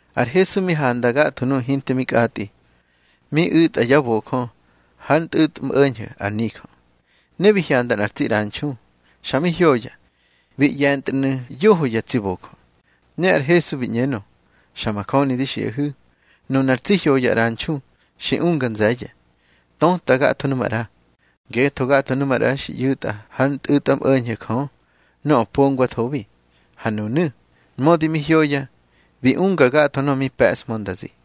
Ar Hesu mi handa gatho nuꞌu̱ hinte mi kꞌatꞌi, mi u̱tꞌa yá bojö hár ntꞌu̱tmꞌo̱ñho̱ ar nijö. Ne bi hyanda nꞌar tsi ꞌranxu, xa mi hyoya, bi ꞌye̱ntnu̱ yoho ya tsi bojö. Ne ar Hesu bi ꞌñenö: —Xa majöni di xiꞌahu̱, nunar tsi hyoya ꞌranxu xi unga nze̱ye̱, töta gatho nu maꞌra. Ngetho gatho nu maꞌra xi ꞌyu̱tꞌa hár ntꞌu̱tmꞌo̱ñho̱ Jö nöꞌö pongwathobi. Ha nunu̱, mödi mi hyoya, bi unga gatho nöꞌö mi pe̱ꞌshmö nda zi.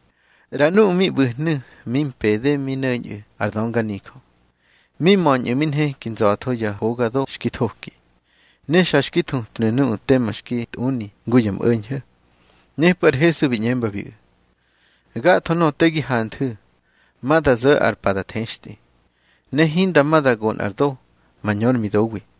ꞌRa nuꞌu̱ mi ꞌbu̱hnu̱ mi mpede mi no̱ñꞌu̱ ar dönganijö. Mi möñꞌu̱ mi nheki nza̱tho ya hoga do xki thoki, ne xa xki thutnu̱ nuꞌu̱ tema xki tꞌuni ngu ya mꞌo̱ñho̱. Nepꞌu̱ ar Hesu bi ꞌñembabiꞌu̱: —Gatho nöꞌö te gi hanthu̱, ma da zo̱ ar pa da thextꞌi, ne hinda ma da go nꞌar do mañö ár midowi.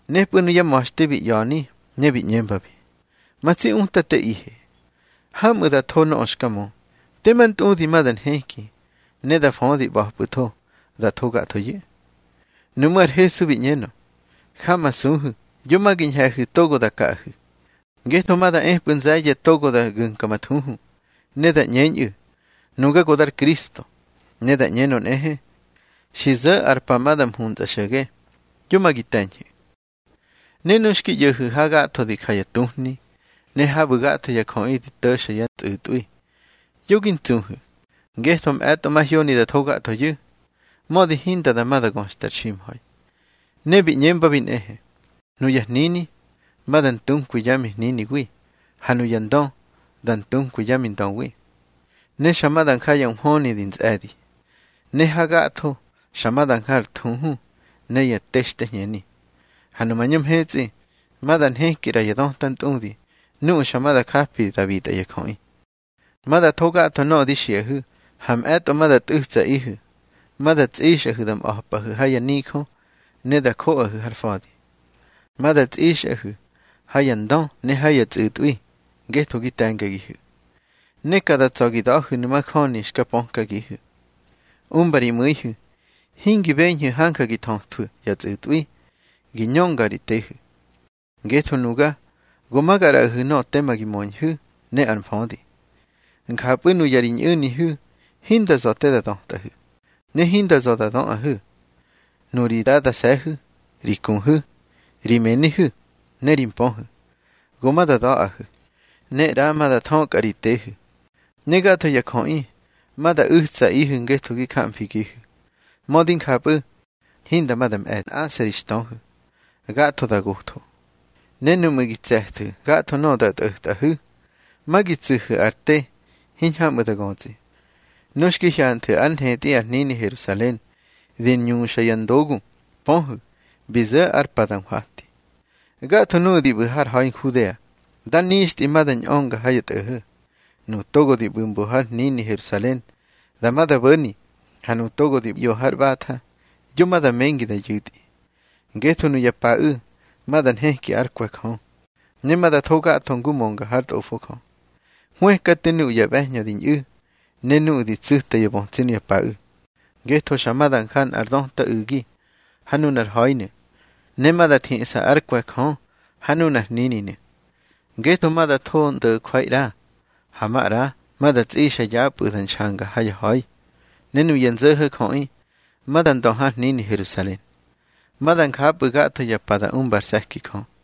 Nepꞌu̱ nuyá ma̱xte bi ꞌya̱ni ne bi ꞌñembabi: —Ma tsi Utateꞌihe, hamꞌu̱ da tho nöꞌö xka mö. Tema ntꞌudi ma da nheki ne da födi ꞌba̱pꞌu̱tho da tho gathoyu̱. Nuꞌmú̱ ar Hesu bi ꞌñenö: —Jamasuhu̱, yo ma gi ñhe̱hu̱ togo da kaꞌahu̱. Ngetho ma da epꞌu̱ nze̱ye̱ togo da gu̱mka ma thuhu, ne da ꞌñeñꞌu̱: Nuga go dar Kristo. Ne da ꞌñenö nꞌehe: Xi zo̱ ar pa ma da mhuntsꞌa xo̱ge. Yo ma gi te̱ñhu̱. Ne nu xki ꞌyo̱hu̱ hagatho di ja ya tuhni, ne habu̱ gatho ya jöꞌi di to̱xa ya tsꞌu̱tꞌwi, yo gi ntsuhu̱. Ngetho mꞌe̱tꞌo mahyoni da tho gathoyu̱, mödi hinda dama göxta ar ximha̱i. Ne bi ꞌñembabi nꞌehe: —Nuya hnini ma da ntunkwi yá mihniniwi, ha nuya ndö da ntunkwi yá mindöwi. Ne xa ma da nja ya nhwöni di ntsꞌe̱di, ne hagatho xa ma da nja ar thuhu ne ya textehñeni. Ha nu mañö mhetsꞌi, ma da nheki ꞌra ya döta ntꞌudi nuꞌu̱ xa ma da japi da bitꞌa ya jöꞌi. Ma da tho gatho nöꞌö di xiꞌahu̱. Ha mꞌe̱tꞌo ma da tꞌu̱tsaꞌihu̱, ma da tsꞌixꞌahu̱ da mꞌa̱pꞌahu̱ ha yá nijö, ne da joꞌahu̱ har fa̱di. Ma da tsꞌixꞌahu̱ ha ya ndö ne ha ya tsꞌu̱tꞌwi ngetho gi te̱ngagihu̱. Ne ka da tsa̱ gi da̱hu̱nu̱ majöni xka pökagihu̱. Umba ri mu̱ihu̱ hingi beñhu̱ hanja gi thöthwu̱ ya tsꞌu̱tꞌwi gi ñönga ri tehu̱. Ngetho nuga go ma ga ꞌraꞌahu̱ nöꞌö tema gi möñhu̱ ne ar mfödi. Njapꞌu̱ nuya ri ñꞌu̱nihu̱ hinda za̱ te da dötꞌahu̱, ne hinda za̱ da döꞌahu̱. Nuri dadase̱hu̱, ri kuhu̱, ri mënihu̱, ne ri mpöhu̱, go ma da da̱ꞌahu̱, ne ꞌra ma da thökꞌa ri tehu̱. Ne gatho ya jöꞌi ma da u̱tsaꞌihu̱ ngetho gi jamfigihu̱. Mödi njapꞌu̱, hinda ma da mꞌe̱ nꞌase̱ ri xtöhu̱, gatho da gotho. Ne nuꞌmu̱ gi tse̱thu̱ gatho nöꞌö da tꞌo̱tꞌahu̱, ma gi tsu̱hu̱ ar te hiñhamꞌu̱ da götsꞌi. Nu xki hyanthu̱ ár nthetꞌi ar hnini Herusalen di ñuxa ya ndogu, pöhu̱, bi zo̱ ar pa da nhwati. Gatho nuꞌu̱ di ꞌbu̱ har ha̱i Nhudea, dá nixtꞌi ma da ñꞌönga ha ya tꞌo̱ho̱. Nuꞌu̱ togo di ꞌbu̱ mbo har hnini Herusalen, dama da bo̱ni. Ha nuꞌu̱ togo di ꞌyo har ꞌbatha, yo ma da mengi da yu̱tꞌi. Ngetho nuya paꞌu̱ ma da nheki ár kwe̱ Jö, ne ma da tho gatho ngu mönga hár Tꞌofo Jö. Hwëkate nuꞌu̱ ya ꞌbe̱hñö di ñꞌu̱, ne nuꞌu̱ di tsu̱ta yá bötsi nuya paꞌu̱. Ngetho xa ma da nja nꞌar döta u̱gi ha nunar ha̱inu̱, ne ma da thiꞌsa ár kwe̱ Jö ha nunar hnininu̱. Ngetho ma da tho ndo̱jwai ꞌra, ha maꞌra ma da tsꞌixa yapꞌu̱ da nxanga ha ya ha̱i. Ne nuya nzo̱ho̱ jöꞌi ma da ndö har hnini Herusalen. Ma da njapꞌu̱ gatho ya pa da umba ar se̱ki Jö.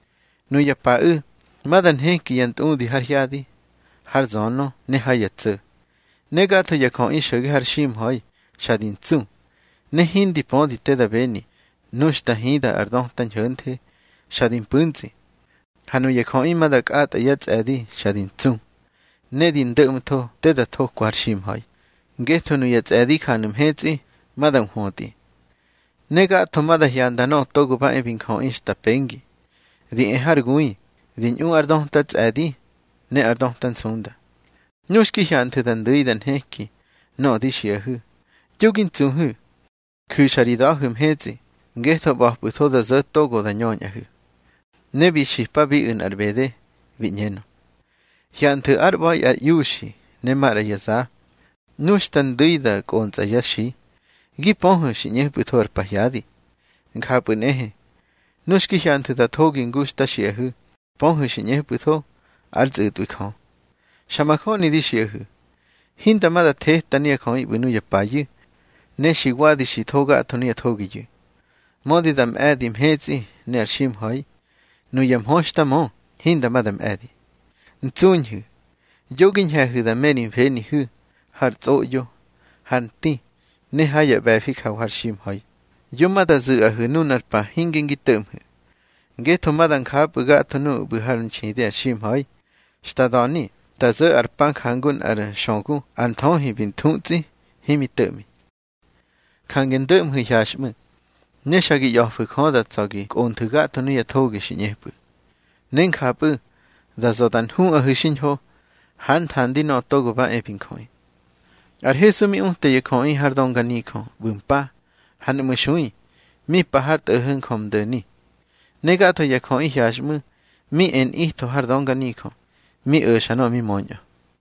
Nuya paꞌu̱ ma da nheki ya ntꞌudi har hyadi, har zönö ne ha ya tso̱. Ne gatho ya jöꞌi xo̱ge har ximha̱i xa di ntsu, ne hindi pödi te da beni nu xta hida ar döta ñho̱nthe xa di mpu̱ntsꞌi. Ha nuya jöꞌi ma da kꞌatꞌa yá tsꞌe̱di xa di ntsu, ne di ndo̱ꞌmtho te da thokwa har ximha̱i, ngetho nuya tsꞌe̱di janu̱ mhetsꞌi ma da nhwötꞌi. Ne gatho ma da hyanda Nöꞌö Togo ba e bi Njöꞌi xta pengi, di e har gui di ꞌñu ár döta tsꞌe̱di ne ár döta nsunda. Nu xki hyanthu̱ da ndu̱i da nheki nöꞌö di xiꞌahu̱, yo gi ntsuhu̱. Ju̱xa ri da̱hu̱ mhetsꞌi, ngetho ꞌba̱pꞌu̱tho da zo̱ togo ma da ñöñꞌahu̱. Ne bi xipabiꞌu̱ nꞌar ꞌbede, bi ꞌñenö: —Hyanthu̱ ár ꞌba̱i ar iuxi ne maꞌra ya za. Nu xta ndu̱i da kꞌontsꞌa yá xi, gi pöhu̱ xi ꞌñepꞌu̱tho ar pahyadi. Njapꞌu̱ nꞌehe, nu xki hyanthu̱ da thogi ngu xta xiꞌahu̱, pöhu̱ xi ꞌñepꞌu̱tho ár tsꞌu̱tꞌwi Jö. Xa majöni di xiꞌahu̱, hinda ma da theta nuya jöꞌi ꞌbu̱ nuya payu̱, ne xi wadi xi tho gatho nuya thogiyu̱. Mödi da mꞌe̱di mhetsꞌi ne ar ximha̱i, nuya mhö xta mö hinda ma da mꞌe̱di. Ntsuñhu̱, yo gi ñhe̱hu̱ da me ri mfenihu̱ har tsꞌoꞌyo, har nti, ne ha ya ꞌbe̱fi jawa har ximha̱i, yo ma da zu̱ꞌahu̱ nunar pa hinge ngi to̱ꞌmhu̱. Ngetho ma da njapꞌu̱ gatho nuꞌu̱ ꞌbu̱ hár nxidi ar ximha̱i, xta da̱ni da zo̱ ar pa, njangu nꞌár xögu ar nthöhi bi thu̱tsꞌi, himi to̱ꞌmi. Jange ndo̱ꞌmhu̱ hyaxꞌmu̱, ne xa gi ꞌya̱fu̱ Jö da tsa̱ gi kꞌonthu̱ gatho nuya thogi xi ꞌñepꞌu̱, ne njapꞌu̱ da za̱ da nhuꞌahu̱ xiñho hár nthandi Nöꞌö Togo ba e bi Njöꞌi. Ar Hesu mi uta ya jöꞌi har dönganijö ꞌbu̱ mpa, ha nuꞌmu̱ xui mi pa har tꞌo̱ho̱ Njömdo̱ni. Ne gatho ya jöꞌi hyaxꞌmu̱ mi e nꞌitho har dönganijö, mi o̱xa nöꞌö mi möñꞌö.